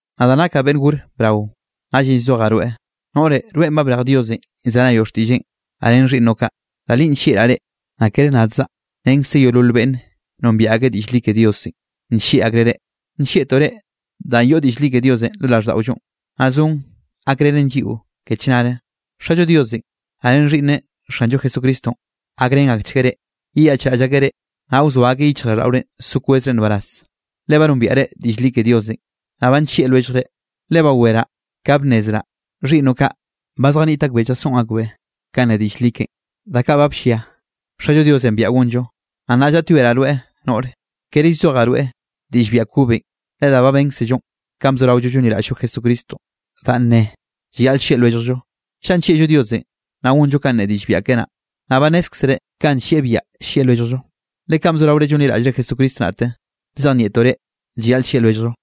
Nadaꞌ nakaꞌ beꞌnn gore brao, naꞌllenꞌ llzojaꞌ rweꞌ, noꞌre. Rweꞌn ba brej Diosenꞌ llzenayoꞌ xtiꞌlleꞌn, naꞌ ren xhiꞌnnoꞌ kaꞌ. Da linꞌ nllieꞌraꞌ reꞌ, naꞌ kere nadzaꞌ, renkze yeolol beꞌnn nombiaꞌ ak diꞌll li ke Diosenꞌ, nllieꞌ akreꞌ reꞌ. Nllieꞌtoꞌ reꞌ danꞌ yoꞌ diꞌll li ke Diosenꞌ lo raꞌlldaꞌollo, naꞌ zon gakrenen lliꞌo ke chnare. Xallo Diosenꞌ, naꞌ ren Xhiꞌnneꞌ Xanllo Jesucristonꞌ, gakrén akchgueꞌ reꞌ, yeyaꞌchraꞌll akeꞌ reꞌ, naꞌ wzoa akeꞌ yichjraꞌlldaꞌorenꞌ so kwezre nbaraz, le ba nombiaꞌre diꞌll li ke Diosenꞌ, naꞌ ba nllieꞌ lwelljre. Le baweraꞌ ka bnnezraꞌ xhiꞌnnoꞌ kaꞌ, ba zjaniꞌt akbeꞌ llasoꞌn akbeꞌ kanꞌ ne diꞌll li keꞌen, da kaꞌ ba bllia Xallo Diosenꞌ biaꞌa gonllo. Naꞌ nnaꞌ llaꞌtyoeraꞌ rweꞌ noꞌre, kere llzojaꞌ rweꞌ diꞌll biaꞌa kobenꞌ, le da ba bénkzello kanꞌ bzoraollo llonliraꞌll-llo Jesucristonꞌ danꞌ ne: llayaꞌl llieꞌ lwelljllo. Chaꞌ nllieꞌllo Diosenꞌ, naꞌ gonllo kanꞌ ne diꞌll biaꞌa keꞌe naꞌ. Naꞌ ba nnézkzere kanꞌ nllieꞌ biaꞌa llieꞌ lwelljllo, le kanꞌ bzoraore llonliraꞌllre Jesucristo naꞌte, bzejnieꞌtoꞌ reꞌ llayaꞌl llieꞌ lwelljllo.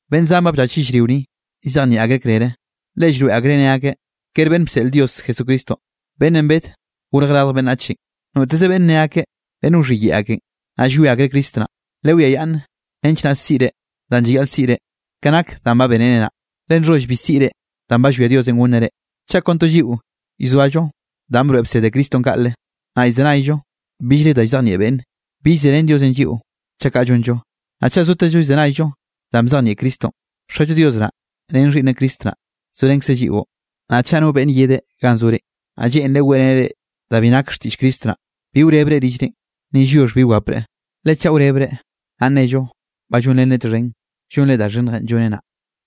Beꞌnn zan ba bllach yellrio ni, llzejnieꞌ akreꞌ krere, le llroeꞌ akreꞌ ne akeꞌ, kere beꞌnn bseꞌl Dios Jesucristonꞌ beꞌnnenꞌ bed gorje radj beꞌnnachenꞌ. Noteze beꞌnn ne kaꞌ, beꞌnn wxhiyeꞌe akenꞌ, naꞌ llwie akreꞌ Cristo naꞌn. Lewiayaꞌnn nench naꞌ siꞌre danꞌ llayaꞌl siꞌre, ke nak danꞌ ba benre naꞌ, le nxholl bi siꞌre danꞌ ba llwia Diosenꞌ gonneꞌ reꞌ. Chaꞌ kon to lliꞌo llzoallo danꞌ broeꞌ bsed Cristonꞌ kaꞌle, naꞌ llzenayllo billre da llzejnieꞌ beꞌnne, bill zerén Diosenꞌ lliꞌo chaꞌ kaꞌ llonllo. Naꞌ chaꞌ zotezllo llzenayllo danꞌ bzejnieꞌ Cristonꞌ, Xallo Dios naꞌ ren Xhiꞌnneꞌ Cristo naꞌ, zorenkzeꞌ lliꞌo. Naꞌ chaꞌ no beꞌnn yede ganꞌ zore, naꞌ lleꞌnreꞌ weꞌreneꞌ reꞌ da bi nake xtiꞌll Cristo naꞌ, bi wrebreꞌ rillrenꞌ, ni lliox bi wapre. Le chaꞌ wrebreꞌ, naꞌ nnello ba llonrenreꞌ txhen llonre da xhinnjenꞌ lloneꞌ naꞌ.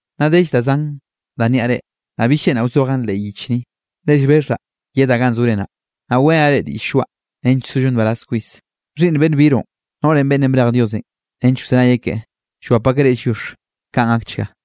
Nna dell da zan da nniaꞌ reꞌ, naꞌ bill lleꞌnraꞌ wzojaꞌn leꞌ yich ni. Le llbexhaꞌ yedaꞌ ganꞌ zore naꞌ, naꞌ weꞌrenaꞌ reꞌ diꞌll lloaꞌ nench sollo nbaraz kwis. Xhiꞌnn beꞌnn biroꞌn, noꞌrenꞌ beꞌnnenꞌ brej Diosenꞌ nench wzenayeꞌ keꞌe, llwap akeꞌ reꞌ lliox. Kaꞌn gakchga.